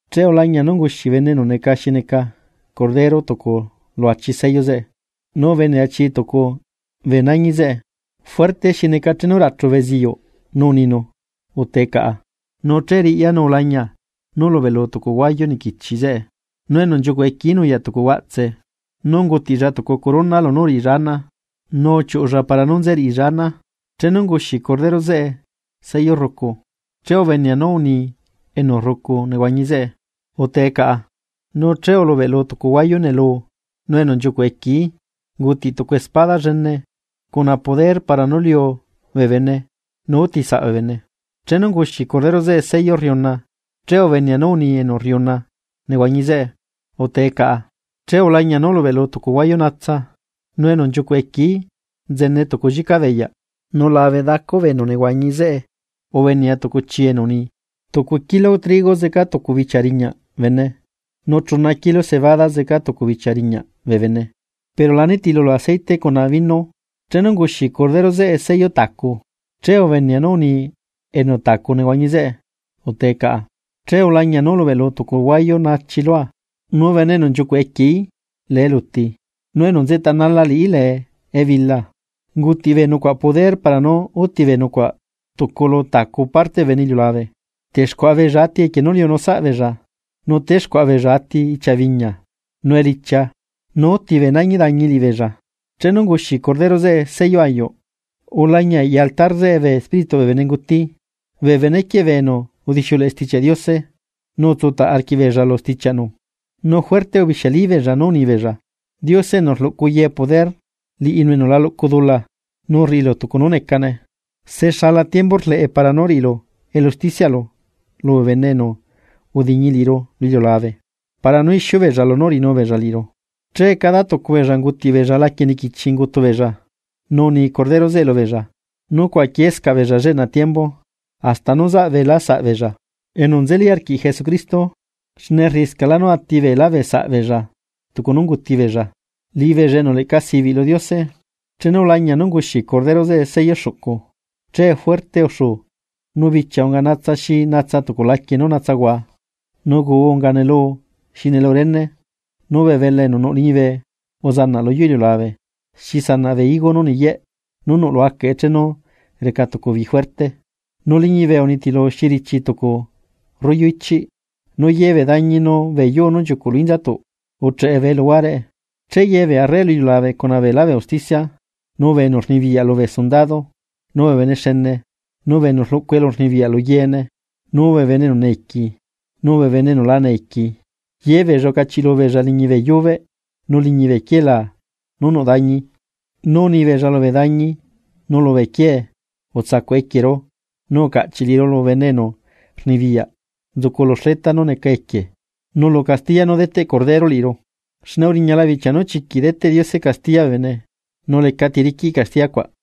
Che ulañia nú unguxi bene enu neca xi neca Cordero tucu lu achi sello zeꞌe, nu ubenea chi tucu bee nañi zeꞌe, fuerte xi neca chenu rachu beziyuꞌ nu uninu: ―¡Utee caꞌa! Nu che riꞌya nu ulañia nú ulubeꞌlu tucu huayu niquichi zeꞌe, nu enu nchiucuꞌ equieí nuyaꞌ tucu huaꞌtse. Nu ungutiꞌlla tucu corona lunú uriꞌilla ana, nu uchiuꞌulla para nú nze riꞌilla ana. Chenu unguxi Cordero zeꞌe sello rrucu, che ubenea nú uni enu rrucu nehuañi zeꞌe: ―¡Utee caꞌa! Nu che ulubeꞌlu tucu huayu nelu, nu enu nchiucuꞌ equieí ungutiꞌ tucu espada llene cuna poder para nú liu bee bene nu útisaꞌ bee bene. Chenu unguxi Cordero zeꞌe sello rriuna, che ubenea nú uni enu rriuna nehuañi zeꞌe: ―¡Utee caꞌa! Che ulañia nú ulubeꞌlu tucu huayu natsa, nu enu nchiucuꞌ equieí nzene tucu llica beyaꞌ. Nu labe dacu bee enu nehuañi zeꞌe ubenea tucu chii enu uni: ―Tucu kilo trigo zeca tucu bichia riñaꞌ bene, nu chuna kilo cebada zeca tucu bichia riñaꞌ bee bene, pero la nitilulu aceite cuna viño. Chenu unguxi Cordero zeꞌe sello tacu, che ubenea nú uni enu tacu nehuañi zeꞌe: ―¡Utee caꞌa! Che ulañia nú ulubeꞌlu tucu huayu nachi lua, nu enu nchiucuꞌ equieí lee eluti, nu enu nzeꞌtanala liꞌí lee ebila. Ungutiꞌ bee nucuaꞌ poder para nú úti bee nucuaꞌ tucu lu tacu parte bee bene iliulabe. Texcuaꞌa beella ati equie nú liunu saꞌbeella, nu texcuaꞌa beella ati ichia biñia, nu elichia, nu úti bee nañi dañi liꞌibeella. Chenu unguxi Cordero zeꞌe sello ayuꞌ, ulañia eꞌya altar zeꞌe bee espírituꞌ bee bene enu unguti bee benequieꞌ bee enu udixiuleꞌe Stichiaꞌ Diose nu utsutaꞌ arquiꞌbeella lu stichiaꞌnu. Nu fuerte ubixiali beella nú unibeella: ―Diose enu rluꞌcu ye poder, liꞌilu enu la luꞌcu dula nu rriꞌilu tucu nú necane, ¿se xala tiembu rleꞌe para nú riꞌilu elu usticiaꞌlu lubee bene enu udiñi liꞌiru lu iliulabe para nú ixiu beella lunú uriꞌinu beella liꞌiru? Che cada tucu beella ungutiꞌ beella laquie niquichi ungutu beella nu uni Cordero zeꞌe lubeella nú cuaꞌaquiescaꞌ beella lleꞌna tiembu, hasta nú zaꞌ beela saꞌ beella enu nzeli arquiꞌ Jesucristo, xne rriꞌiscaꞌla nú ati beela bee saꞌ beella tucu nú unguti beella, liꞌibeella enu leꞌca sibiꞌ lu Diose. Chenu ulañia nú unguxi Cordero zeꞌe sello xuꞌcu, che fuerte uxuu, nu bichia unga natsa xi natsa tucu laquie nú natsahua, nu guu unga neluu xi neluu rene, nu bee belaa enu nuꞌ liñibe uzanaꞌ lu yuu iliulabe xi sanaꞌ bee higos nú niyeꞌ nuꞌ lu acaꞌe chenu reca tucu bi fuerte. Nu liñibe unitilu xi richi tucu rollo ichiꞌ, nu yebee dañi nu bee yuu nú nchiucuꞌ lu inzatuꞌ ucheꞌe bee luhuareꞌe. Che ye bee arre lu iliulabe cuna beelá bee usticia, nu bee enu rnibiyaꞌ lubee sundado, nu bee bene xene, nu bee enu rluꞌcu elurnibiyaꞌ lu yeene, nu bee esclavo, nu bee enu laca esclavo ye beella ucachiꞌlu beella liñi bee yubeꞌ nu liñi bee quielaa nú nuꞌ dañi. Nu unibeella lu dañi nu lubee quiee: ―Utsaꞌcuꞌhua equieru, nu ucaꞌchiꞌ liꞌiru lu bene enu rnibiyaꞌ nzucu lu xleta nú neca equie, nu lu castiya nú deteꞌ Cordero liꞌiru. Xne uriñala bichia nú chiquiꞌ deteꞌ Diose castiya bee bene, ¿nu lecati riquiꞌ castiya cuaꞌ?